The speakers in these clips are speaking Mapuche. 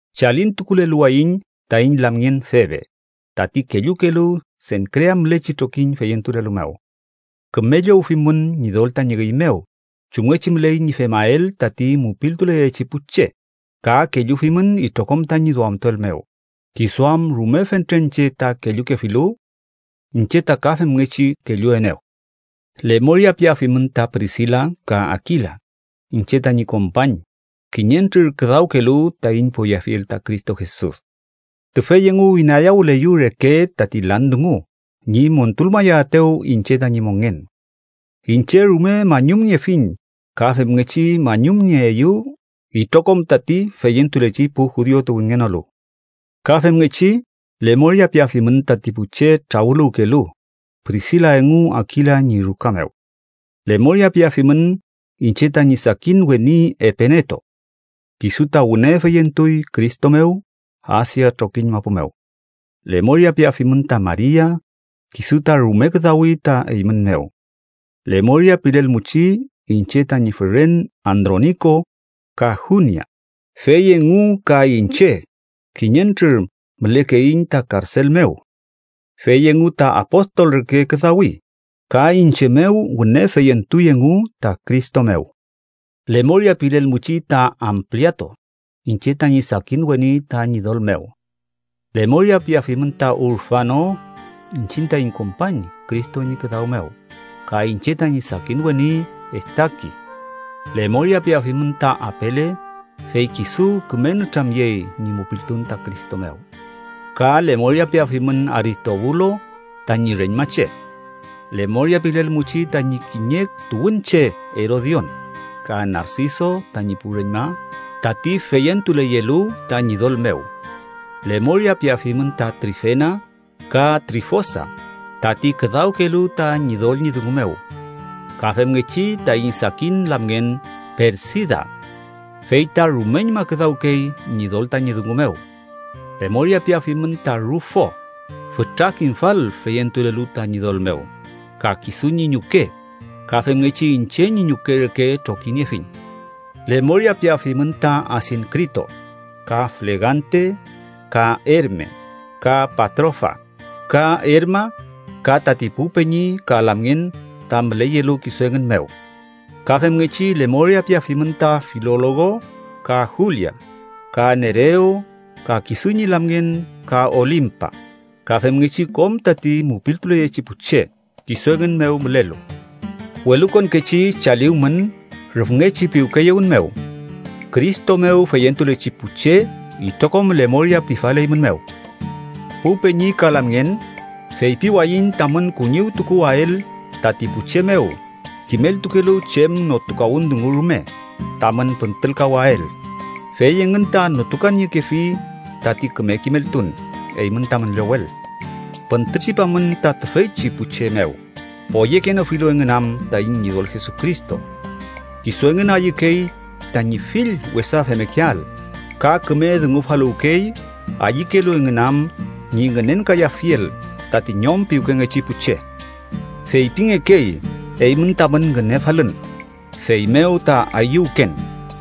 Chalintukuleluwayiñ taiñ lamngen Febe, tati kellukelu Senkrea mülechi trokiñ feyentulelu mew. Küme llowfimün Ñidol tañi üy mew, chumngechi müley ñi femael tati mupiltuleyechi pu che, ka kellufimün itrokom tañi duamtuel mew, kisu am rume fentren che ta kellukefilu. Iñche ta ka femngechi kelluenew. Lemoria piafimün ta Prisila ka Akila, iñche tañi kompañ kiñentrür küdawkelu taiñ poyeafiel ta Cristo Jesus. Tüfey engu inayawüleyew reke tati lan dungu ñi montulmayaetew iñche tañi mongen. Iñche rume mañumniefiñ, ka femngechi mañumnieeyew itrokom tati feyentulechi pu judiu tuwünngenolu. Ka femngechi lemoria piafimün tati pu che trawüluwkelu Prisila engu Akila ñi ruka mew. Lemoria piafimün iñche tañi sakin weni Epeneto. Kisu ta wüne feyentuy Cristo mew Asia trokiñ mapu mew. Lemoria piafimün ta Maria, kisu ta rume küdawi ta eymün mew. Lemoria pilelmuchi iñche tañi füren Androniko ka Junias, fey engu ka iñche kiñentrür mülekeiñ ta karsel mew. Fey engu ta apostol reke küdawi, ka iñche mew wüne feyentuy engu ta Cristo mew. Lemoria pilelmuchi ta Ampliato, iñche tañi sakin weni ta Ñidol mew. Lemoria piafimün ta Urfano, iñchiñ taiñ kompañ Cristo ñi küdaw mew, ka iñche tañi sakin weni Estaki. Lemoria piafimün ta Apele, fey kisu küme nütramyey ñi mupiltun ta Cristo mew. Ka lemoria piafimün Aristobulos tañi reñmache. Lemoria pilelmuchi tañi kiñe tuwünche Erodion, ka Narsiso tañi pu reñma tati feyentuleyelu ta Ñidol mew. Lemoria piafimün ta Trifena ka Trifosa, tati küdawkelu ta Ñidol ñi dungu mew. Ka femngechi taiñ sakin lamngen Persida. Fey ta rumeñma küdawkey Ñidol tañi dungu mew. Lemoria piafimün ta Rufo, fütra kimfal feyentulelu ta Ñidol mew, ka kisu ñi ñuke, ka femngechi iñche ñi ñuke reke trokiniefiñ. Lemoria piafimün ta Asinkrito, ka Flegante, ka Ermes, ka Patrofas, ka Ermas ka tati pu peñi ka lamngen ta müleyelu kisu engün mew. Ka femngechi lemoria piafimün ta Filologo ka Julia, ka Nerew ka kisu ñi lamngen, ka Olimpas ka femngechi kom tati mupiltuleyechi pu che kisu engün mew mülelu. Welukonkechi chaliwmün rüfngechi piwkeyewün mew. Cristo mew feyentulechi pu che itrokom lemoria pifaleymünmew. Pu peñi ka lamngen, feypiwayiñ tamün kuñiwtukuael tati pu che mew kimeltukelu chem notukawün dungu rume tamün püntülkawael, fey engün ta notukaniekefi tati küme kimeltun eymün tamün llowel. Püntütripamün ta tüfeychi pu che mew, poyekenofilu engün am taiñ Ñidol Jesucristo. Kisu engün ayükey tañi fill wesa femmekeael, ka küme dungufaluwkey ayükelu engün am ñi ngünenkayafiel tati ñom piwkengechi pu che. Feypingekey eymün tamün ngünefalün, feymew ta ayüwken,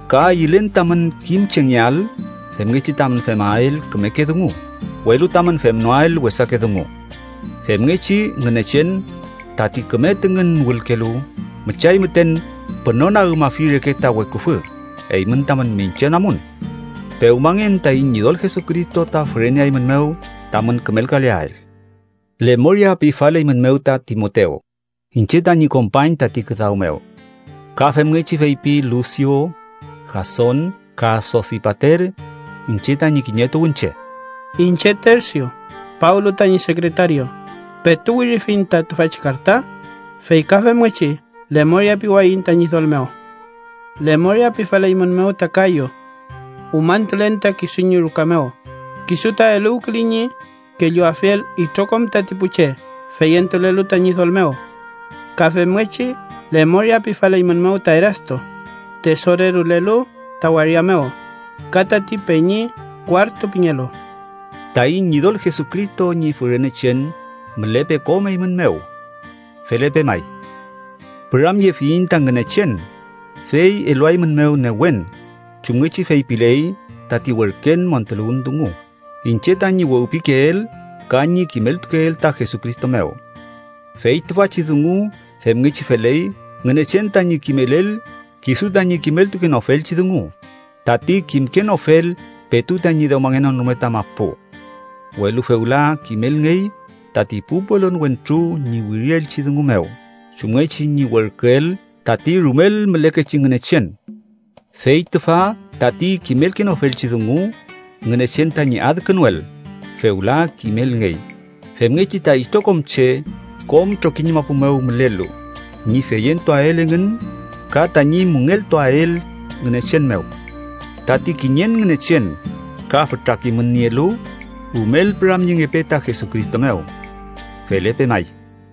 ka ayülen tamün kimchengeael femngechi tamün femael kümeke dungu, welu tamün femnoael wesake dungu. Femngechi Ngünechen, tati küme tüngün wülkelu, müchay müten pünonagümafi reke ta weküfü eymün tamün miñche namun. Pewmangen taiñ Ñidol Jesucristo ta füreneaeymünmew tamün kümelkaleael. Lemoria pifaleymünmew ta Timotew, iñche tañi kompañ tati küdaw mew. Ka femngechi feypi Lusiu, Jason ka Sosipater, iñche tañi kiñe tuwünche. Iñche, Tersiu, Pablo tañi sekretario petu wirifiñ ta tüfachi karta, fey ka femngechi lemoria piwayiñ ta Ñidol mew. Lemoria pifaleymünmew ta Kayo. Umañtulen ta kisu ñi ruka mew, kisu ta eluwküley ñi kelluafiel itrokom tati pu che feyentulelu ta Ñidol mew. Ka femngechi lemoria pifaleymünmew ta Erasto, tesorerolelu ta waria mew, ka tati peñi Kuartu pingelu. Taiñ Ñidol Jesucristo ñi fürenechen mülepe kom eymün mew. Felepe may. Püramyefiyiñ ta Ngünechen, fey eluaeymünmew newen chumngechi feypiley tati werken montuluwün dungu iñche tañi wewpikeel ka ñi kimeltukeel ta Jesucristo mew. Fey tüfachi dungu femngechi feley Ngünechen tañi kimelel kisu tañi kimeltukenofelchi dungu, tati kimkenofel petu tañi dewmangenon rume ta mapu. Welu fewla kimelngey tati pu pelon wentru ñi wirielchi dungu mew, chumngechi ñi werküel tati rumel mülekechi Ngünechen. Fey tüfa tati kimelkenofelchi dungu Ngünechen tañi adkünuel fewla kimelngey, femngechi ta itrokom che kom trokiñ mapu mew mülelu ñi feyentuael engün ka tañi müngeltuael Ngünechen mew. ¡Tati kiñen Ngünechen ka fütra kimün nielu, rumel püramyengepe ta Jesucristo mew! Felepe may.